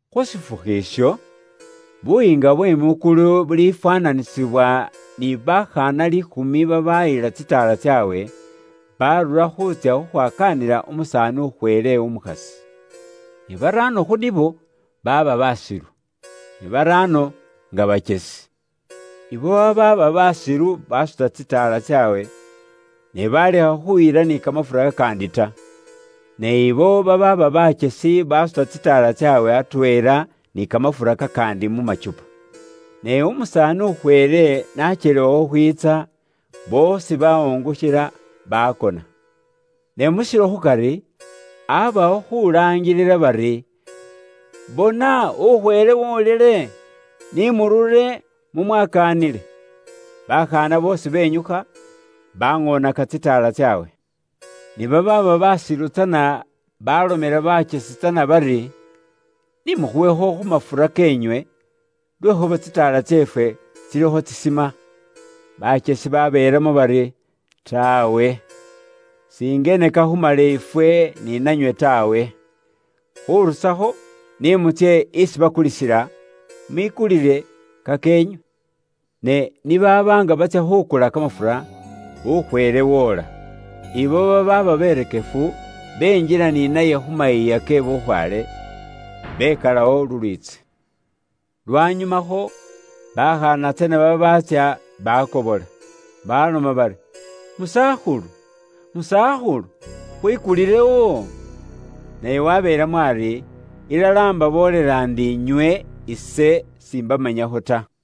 “Khu shifukhu isho, Buyiinga bwe mwikulu bulifwaananisibwa ni bakhaana liikhumi babaayila tsitaala tsaabwe, baarura khuutsya khukhwakaanila umusaani ukhweele umukhasi. Ne baraano khu nibo baaba basilu, ne baraano nga bakyesi. Abo babaaba baasilu baasuta tsitaala tsaabwe, ne baalekha khuyila ni kamafura kakaandi ta. Ne abo babaaba bakyesi baasuta tsitaala tsaabwe atweela ni kamafura kakaandi mu shiindu. Ne umusaani ukhweele n'akyelewa khukhwiitsa, boosi baawungukhila, baakona. Ne mu shilo khukari, aabawo khuulaangilila bari, ‘Bona ukhweele woolile, ni murure mu mwakaanile.’ Bakhaana boosi benyukha, baŋoonaka tsitaala tsaabwe. Ne babaaba baasilu tsana baalomela bakyesi bari, ‘Ni mukhuwekho khu mafura keenywe, lwekhuuba tsitaala tseefwe tsilikho tsisima.’ Bakyesi babeelamo bari, ‘Taawe, singene kakhumale ifwe ni nanywe taawe. Khurusakho, ni mutsye isi bakulisila, mwikulile kakeenywe.’ Ne ni baaba nga batsya khukula kamafura, ukhweele woola. Ibo babaaba berekefu, benjila ni naye khu mayiiya ke bukhwaale, bekalawo lulwiitsi. Lwanyumakho bakhaana tsana babaatsya bakobola, baloma bari, ‘Musakhulu, musakhulu, khwikulilewo.’ Naye wabeelamo ari, ‘Ilala imbaboolela ndi inywe ise simbamanyakho ta.’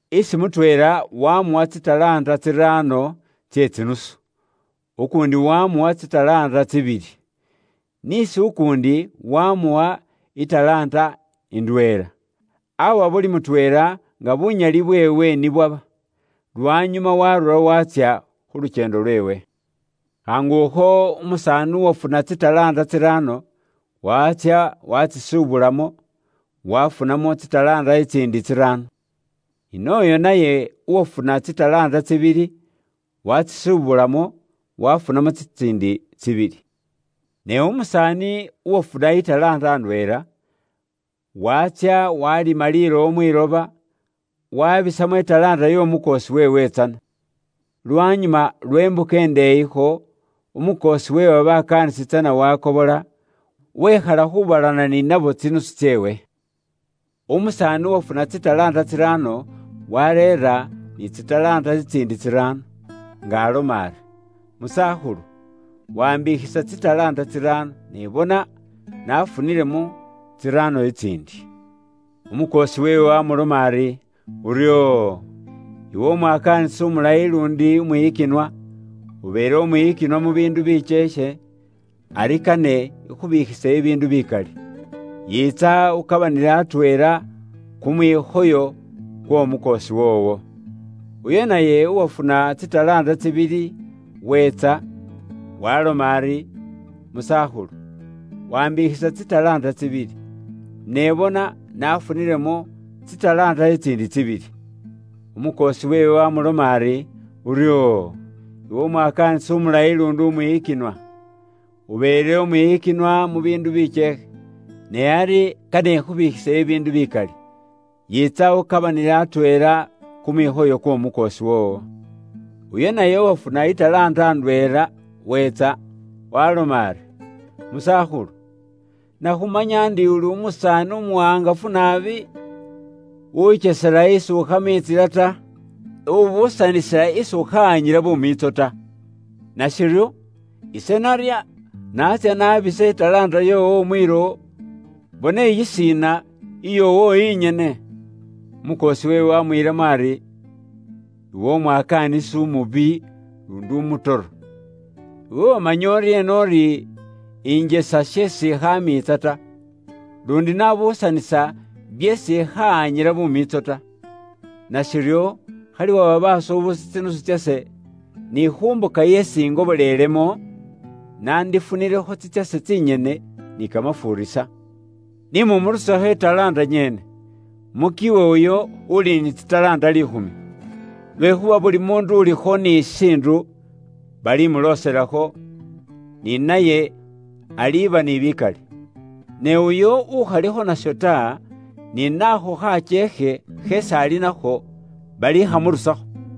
Isi mutweela wamuwa tsi talanta tsiraano tse tsinusu, ukuundi wamuwa tsi talanta tsibili, ni isi ukuundi wamuwa i talanta indweela. Awa buli mutweela nga bunyali bweewe ni bwaba. Lwanyuma waarura waatsya khu lukyeendo lweewe. Khaangukho umusaani uwafuna tsi talanta tsiraano, waatsya waatsisubulamo, waafunamo tsi talanta tsitsiindi tsiraano. Ni nooyo naye uwafuna tsi talanta tsibili, waatsisubulamo waafunamo tsitsiindi tsibili. Ne umusaani uwafuna i talanta indweela, waatsya waalima lilowo mwiloba, waabisamo i talanta y'omukoosi weewe tsana. “Lwanyuma lwe mbuka indeeyikho, umukoosi we babakaanisi tsana waakobola, wekhala khuubalana ni nabo tsinusu tseewe. Umusaani uwafuna tsi talanta tsiraano waareera ni tsi talanta tsitsiindi tsiraano, nga aloma ari, ‘Musakhulu, waambikhisa tsi talanta tsiraano, ne bona, naafunilemo tsiraano tsitsiindi.’ “Umukoosi weewe waamuloma ari, ‘Uryoo! Iwe umwakaanisi umulayi luundi umwiyikinwa, ubeele umwiyikinwa mu biindu bikyeekhe, ari kane ikhubiikhise bibiindu bikali. Yiitsa ukabananile atweela kumwikhoyo kw'omukoosi woowo.’ “Uyo naye uwafuna tsi talanta tsibili weetsa. Waaloma ari, ‘Musakhulu, waambikhisa tsi talanta tsibili, ne bona naafunilemo tsi talanta tsitsiindi tsibili.’ “Umukoosi weewe waamuloma ari, ‘Uryoo! Iwe umwakaanisi umulayi luundi umwiyikinwa. Ubeele umwiyikinwa mu biindu bikyeekhe, ne ari kane ikhubiikhise bibiindu bikali. Yiitsa ukabananile atweela kumwikhoyo kw'omukoosi woowo.’ “Uyo naye uwafuna i talanta ndweela weetsa. Waaloma ari, ‘Musakhulu, nakhumanya ndi uli umusaani umuwaangafu naabi, ukyesela isi ukhaamiitsila ta. Ubuusanisila isi ukhahanyila bumiitso ta. Nashiryo, ise narya, naatsya naabisa i talanta yoowo mwilowo. Bona iyishiina, iyoowo inyene.’ “Umukoosi weewe waamwiilamo ari, ‘Iwe uli umwakaanisi umubi, luundi umutoro! Iwe wamanya uryeena uri ise injesa sheesi ikhaamiitsa ta, luundi nabuusanisa byeesi ise ikhaamiitsa ta? Nashiryo, khali waha basuubusi tsinusu tsase, ni khu mbuka yeesi ingobolelemo, naandifunilekho tsitsase tsinyene ni kamafuurisa. Ni mumurusekho i talanta nyene, mukiwe uyo uuli ni tsi talanta liikhumi. Lwekhuuba buli muundu ulikho ni shishiindu, balimuloselakho, ni naye aliiba ni bikali. Ne uyo ukhalikho nasho ta, ni naakho khakyeekhe kheesi ali nakho, balikhamurusakho.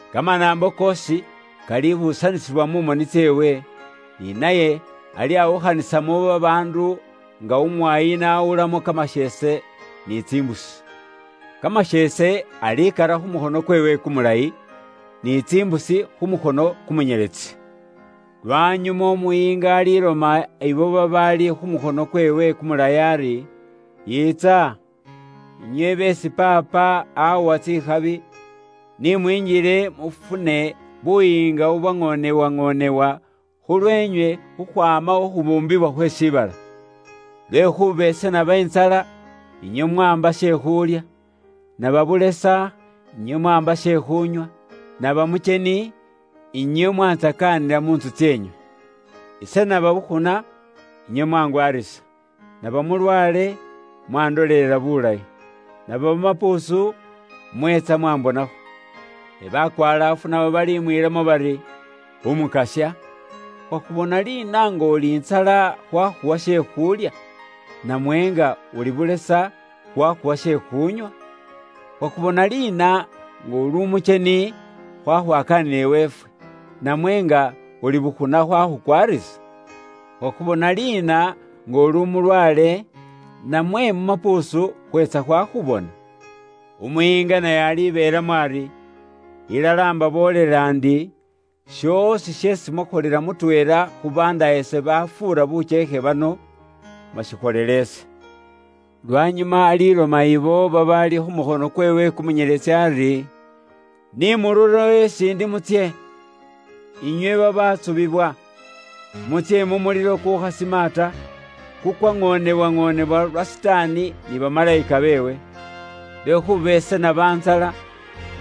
Kamanaambo koosi kalibuusanisibwa mu moni tseewe, ni naye alyawukhanisamo babaandu nga umwaayi n'awulamo kamasheese ni tsimbusi. Kamasheese alikara khu mukhono kweewe kumulayi, ni tsimbusi khu mukhono kumunyeletsi. “Lwanyuma umuyiinga aliloma abo babaali khu mukhono kweewe kumulayi ari, ‘Yiitsa, inywe beesi Paapa awa tsikhabi. Ni mwinjile mufune Buyiinga bubwaŋoonewaŋoonewa khulweenywe khukhwaama khu khubuumbibwa khwe shiibala. Lwekhuuba ise naba intsala, inywe mwaamba she khuulya; naba bulesa inywe mwaamba she khuunywa; naba mukyeni, inywe mwantsakaanila mu ntsu tseenywe. Ise naba bukhuna, inywe mwangwarisa; naba mulwaale, mwandolelela bulayi; naba mu mapuusu, mweetsa mwambonakho.’ “Ne bakwalaafu nabo balimwiilamo bari, ‘Umukasya, khwakhubona liina nga uli ntsala khwakhuwa she khuulya; namwe nga uli bulesa khwakhuwa she khuunywa? Khwakhubona liina nga uli umukyeni khwakhwakaanila iweefwe; namwe nga uli bukhuna khwakhukwaarisa? Khwakhubona liina nga uli umulwaale, namwe mu mapuusu, khweetsa khukhubona?’ Umuyiinga naye alibeelamo ari, ‘Ilala imbaboolela ndi, shoosi sheesi mwakholela mutweela khu bandaayase babafuura bukyeekhe bano, mwashikholela ise.’ “Lwanyuma aliloma abo babaali khu mukhono kweewe kumunyeletsi ari, ‘Ni mururewo isi indi mutsye, inywe babaatsubiwa, mutsye mu mulilo kukuukhasima ta, kukwaŋoonewaŋoonewa lwa Sitaani ni bamalayika beewe. Lwekhuuba ise naba intsala,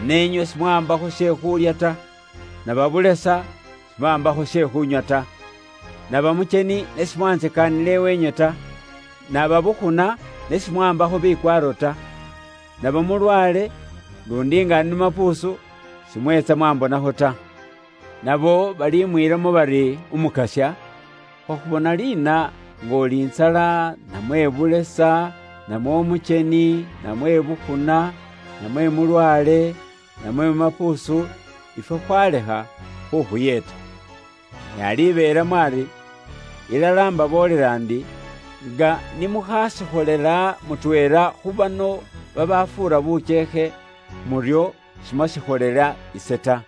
ne inywe simwaambakho she khuulya ta; naba bulesa, simwaambakho she khuunywa ta. Naba mukyeni, ne simwantsakaanila iweenywe ta; naba bukhuna, ne simwaambakho bikwaaro ta; naba mulwaale, luundi nga ndi mu mapuusu, simweetsa mwambonakho ta.’ Nabo balimwiilamo bari, ‘Umukasya, khwakhubona liina nga uli intsala, namwe bulesa, namwe umukyeni, namwe bukhuna, namwe mulwaale, namwe mu mapuusu, ifwe khwalekha khukhuyeeta?’ “Naye alibeelamo ari, ‘Ilala imbaboolela ndi, nga ni mukhaashikholela mutweela khu bano babaafuura bukyeekhe, muryo simwashiikholela ise ta.’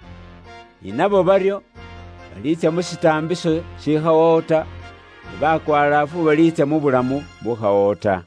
Ni nabo baryo baliitsya mu shitaambiso shikhawawo ta, ne bakwalaafu baliitsya mu bulamu bubukhawawo ta.”